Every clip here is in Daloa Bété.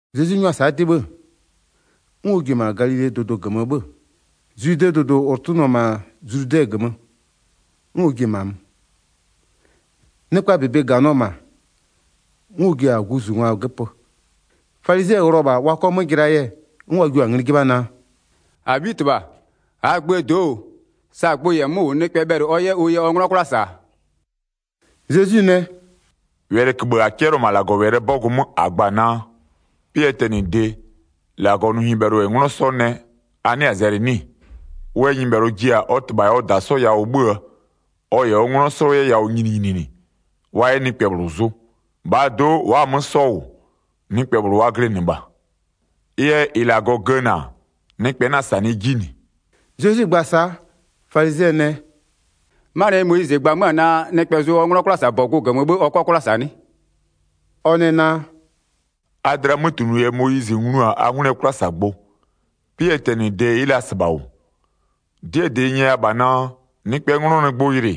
Zezwi 'nyʋa-a sa'a 'dɩ 'bhë, 'n ɔ ji-a -ma Galilee dʋdʋ -gömö 'bhö-ö, Zwidee dʋdʋ -ʋ tʋnʋ-ɔ -ma zludɛ -gömö, 'n ɔ ji-e -ma mö. Nɩkpaa -bebe -ganɩɔ -ma, 'n ɔ ji-a guzungwa göpö. Falizɩɛ ghlɩɔ-ɔ -bha wa 'kɔ 'mö jɩlaa yɛ, 'n wa jio-a ngli 'jɩbha naa: “-Abhitɩbha, -aa gböö do'o, sa gbʋ -yɛ 'mö -wʋ, nɩkpɛ bhɛlɩ ɔ 'yɛ ʋ yɛ ɔ 'nglɔ 'kwla -sa-a?” Zezwi nɛ: “Wɛlɩköbhë -a 'cɛlɩɔ-ɔ -ma -Lagɔwɛlɩɛ 'bɔgʋ 'mö -a gba-a naa: 'Pɩɛ tɛnɩde, -Lagɔ nʋ nyɩbhɛlʋ -yɛ 'nglɔ 'sɔ nɛ, a 'nɩa-a zɛlɩ 'nɩ-ɩ? Ɩ yɛ nyɩbhɛlʋ ji-a ɔ -tɩbha -yɛ ɔ -da 'sɔ yawʋ 'bhö-öö, ɔ -yɛ ɔ 'nglɔ 'sɔ 'yɛ yawʋ nyininyininɩ, wa 'yɛ nɩkpɛ -bhlʋ zʋ. 6-Bhaa do'o wa'a-a 'mö 'sɔ -wʋ, nɩkpɛ -bhlʋ wa glɩnɩ -bha. Ɩ yɛ -ɩ -Lagɔ gëna, nɩkpɛ 'na-a -sanɩɩ 'ji -nɩ.” Zezwi gba-a sa'a, falizɩɛ nɛ: “'Manɩɛ yɛ Moyizɩ gba 'mö-a naa: Nɩkpɛ zʋ ɔ 'nglɔ 'kwlasabɔgʋ -gömö 'bhë ɔ 'kɔ 'kwla -sa 'nɩ?” Ɔ nɛ naa: “A dlɩaa 'mötunʋ yɛ Moyizɩ nglu-a a 'ngwlɩɛ 'kwlasagbʋ. 'Pɩɛ tɛnɩde ɩ'ɩ la -sɩbha -wʋ. 'Dɩɛ -dɩ n nyɛya -bha naa: Nɩkpɛɛ 'nglɔ nɩ gbʋ yɩlɩ,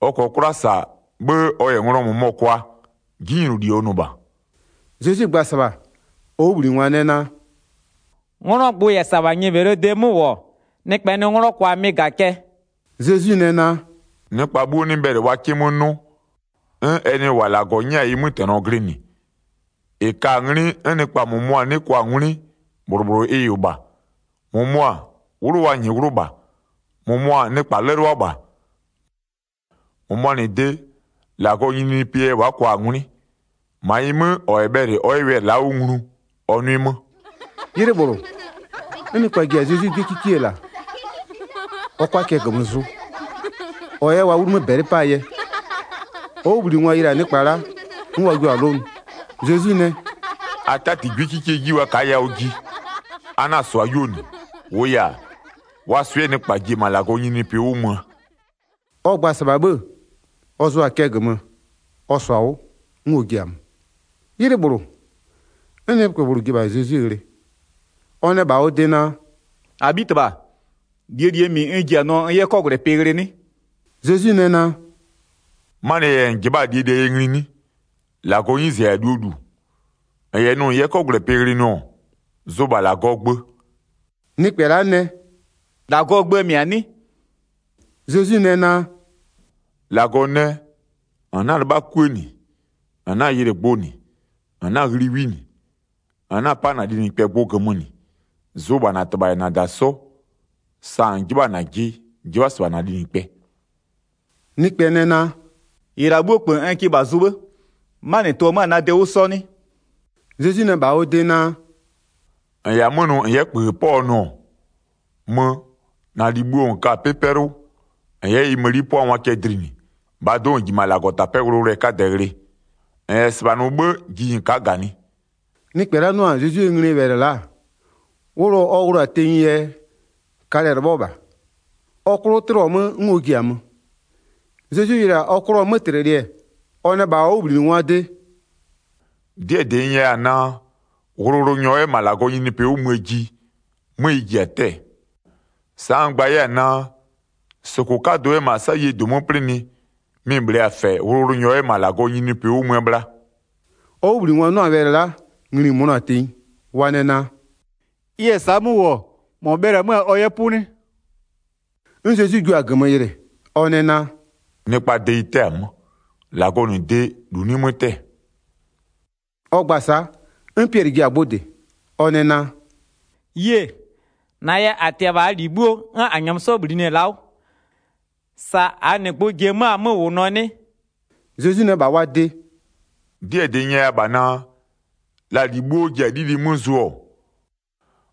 ɔ -kɔɔ 'kwla -sa, 'bhë ɔ -yɛ nglɔ -mʋmɔ kwa, 'jinyloli ɔ nʋ -bha.” Zezwi gba-a -sɩbha, ɔ 'wʋbhlinɩngwa nɛ naa: “'Nglɔɔ gbʋ -yɛ -sa -bha nyɩbhɛlʋɔ de 'mö -wʋ-ɔ, nɩkpɛ nɩ 'nglɔ kwa mɩ-ɩ -ga-a cɛ.” Zezwi nɛ naa: “Nɩkpa 'bhuo 'nɩ bhɛlɩ wa 'kɩ 'mö 'nʋ, 'n ɛ nɩ -wa -Lagɔ 'nyɛ-a ɩ 'mötɛnɔ glɩnɩ. 12-Ɩ ka-a 'nglɩ 'n nɩkpa -mʋmʋa 'nɩ kwa-a 'ngwlɩ, -bhlʋ -bhlʋ ɩ -wʋ -bha. -Mʋmʋa, 'wlʋ wa -nyɩɩ 'wlʋ -bha, -mʋmʋa nɩkpa 'lɛlʋa -bha, -mʋmʋa -nɩ de, -Lagɔɔ nyininyinipɩɛ yɛ wa'a kwa-a 'ngwlɩ. -Ma ɩ 'mö, -ɔ -yɛ bhɛlɩ ɔ 'yɛ wɛlɩ la'a 'wʋ nglu ɔ 'nʋɩ 'mö.” 'Ylɩ -bhlʋ, 'n nɩkpa ji-a Zezwi 'gwiekikie -la ɔ 'kʋa cɛ -gömö zʋ, ɔ 'yɛ wa 'wlumö -bɛlɩ 'paa yɛ. Ɔ 'wʋbhlinɩngwa yɩlɩ-a nɩkpa la'a, 'n wa jua-a 'lʋnʋ. Zezwi nɛ: “A 'tati 'gwiekikie 'ji wa ka'a yawʋ ji, a 'na-a -sʋa 'yuo -nɩ. -Wʋʋ yɛ-a, wa swɩ'ɩɛ nɩkpa ji-e -ma -Lagɔɔ nyininyinipɩ 'wʋ möö.” Ɔ gba-a -sɩbha 'bhë, ɔ zʋʋa-a cɛ -gömö, ɔ -sɔ-a 'wʋ, 'n ɔ ji-a mö. 'Ylɩ -bhlʋ, 'n nɩkpɛ -bhlʋ ji-e -bha Zezwi ghlɩ, ɔ nɛ -bha ɔ de naa: “-Abhitɩbha, -lie -lie -mɩ n ji-a nʋɔ n 'yɛ 'kɔgwlɛpɩ ghlɩ 'nɩ?” Zezwi nɛ naa: “'Manɩɛ yɛ -n -jɩbha'a-a -lie -lie yɛ ngli 'nɩ? -Lagɔɔ 'nyize -yɛ-a -luo -lu. -N -yɛ nʋ -n 'yɛ 'kɔgwlɛpɩ ghlɩ nʋ-ɔ, zʋ -bha -Lagɔɔ gbö.” Nɩkpɛ la'a nɛ: “-Lagɔɔ gböö -mɩ-a 'nɩ?” Zezwi nɛ naa: “-Lagɔ nɛ: -N 'na-a 'lɩbha 'kuë -nɩ, -n 'na-a yɩlɩ gbʋ -nɩ, -n 'na-a ghli 'wi -nɩ, -n 'na-a 'pa -na linɩkpɛ gbʋ -gömö -nɩ. Zʋ -bha -na -tɩbha -yɛ -na -da 'sɔ, sa -n 'jɩbha-a -najɩ, 'jɩbha -sɩbha -na linɩkpɛ.” Nɩkpɛ nɛ naa: “-Ɩ -la 'bhuo -kpö, n kɩ -bha zʋ 'bhë, 'manɩ tʋ-ɔ 'mö-a na de 'wʋ 'sɔ 'nɩ?” Zezwi nɛ -bha ɔ de naa: “-N -yɛ-a 'mö nʋ -n 'yɛ -kpöön 'pɔ-ɔ nʋ-ɔ, mö, -na -li bhuo -n ka-a 'pɩ 'pɛlʋ, -n 'yɛ ɩ mëni 'pʋangwa cɛ dlinɩ. -Bhaa do'o -n ji -ma -Lagɔtapɛ'ɛ 'wʋlʋwʋlʋɛ 'kadɛ ghlɩ. -N -yɛ -sɩbha nʋ 'bhë, ji -n ka'a -ganɩ.” Nɩkpɛ la'a 'nʋ-a Zezwie nglie wɛlɩ la'a, wʋlʋ ɔ wʋlʋ-a tenyie yɛ, 'kalɛ-ɛ 'lɩbhɔ -bha, ɔ 'klʋ 'tlɩɔ 'mö 'n ɔ ji-a mö. Zezwi yɩlɩ-a ɔ 'klʋɔ 'mötlɩlɩ-ɛ, ɔ nɛ -bha ɔ 'wʋbhlinɩngwaa de: “'Dɩɛ -dɩ n nyɛya-a naa: Wʋlʋwʋlʋnyɔ 'yɛ -ma -Lagɔɔ nyininyinipɩ 'wʋ möö ji, 'mö ɩ ji-a 'tɛ-ɛɛ. Sa'a n gba 'yɛ-a naa: -Sʋkʋ 'kadʋ 'yɛ -ma 'sayie -dʋ 'mö 'plɩnɩ, mɩ-ɩ -bhlee-a -fɛ wʋlʋwʋlʋnyɔ 'yɛ -ma -Lagɔɔ nyininyinipɩ 'wʋ möö bhla.” Ɔ 'wʋbhlinɩngwa 'nʋ-a wɛlɩ la'a, ngli-i mönʋa-a tenyi. Wa nɛ naa: “Ɩ -yɛ sa'a 'mö -wʋ-ɔ, -mɔ bhɛlɩ-ɛ 'mö-a ɔ 'yɛ 'pʋ 'nɩ?” 'N Zezwi jua-a -gömö yɩlɩ, ɔ nɛ naa: “Nɩkpaa de ɩ 'tɛ-a 'mö, -Lagɔɔ -nɩ de, -lu 'nɩ 'mö 'tɛ-ɛ.” Ɔ gba-a sa'a, 'n Piɛlɩ ji-a gbʋ -dɩ, ɔ nɛ naa: “Yie, -na yɛ -a tɩ-ɛ -bha -aa -li 'bhuo 'n -a -nyɛmö -bhlinɩ-ɛ la'a 'wʋ. Sa -aa -nɩ gbʋ ji-e 'mö-a 'mö -wʋnʋɔ 'nɩ?” Zezwi nɛ -bha wa de: “'Dɩɛ -dɩ n nyɛya -bha naa: La -li 'bhuo ji-a 'lili 'mö 'zʋɔ-ɔ,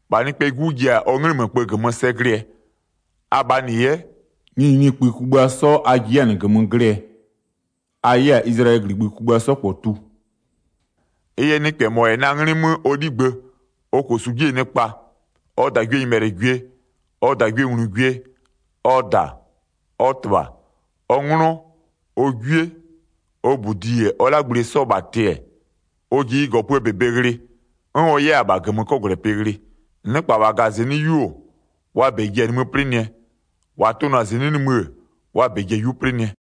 -bha Nɩkpɛɛ 'Gu ji-a ɔ 'nglɩmökpë -gömö sɛ glɩɛ, abhaa -nɩ 'yɛ, nyininyinikpï kugbïa 'sɔ a ji 'yɛ-a -nɩ -gömö glɩɛ, a 'yɛ-a Izlayɛlɩɛ -gligbï kugbïa 'sɔ -kpɔ tu. Ɩ yɛ nɩkpɛ -mɔ -yɛ na 'nglɩ 'mö ɔ 'ligbë, ɔ -kosu 'jie nɩkpa, ɔ -dagwienyɩbhɛlɩgwie, ɔ -dagwienglugwie, ɔ -da, ɔ -tɩbha, ɔ 'nglɔ, ɔ 'gwie, ɔ -budi -yɛ ɔ 'lagblie 'sɔ -bha tɩ-ɛ, ɔ ji ɩ -gɔpöö -bebe ghlɩ, 'n ɔ 'yɛ-a -bha -gömö 'kɔgwlɛpɩ ghlɩ. Nɩkpa -wa -gaa -zɩnɩ'ɩ 'yu-o, wa -bɛ ji-a nimï 'plɩnɩɛ, -wa tʋnʋ-a -zɩnɩ'ɩ nimï-ë, wa -bɛ ji-a 'yu 'plɩnɩɛ.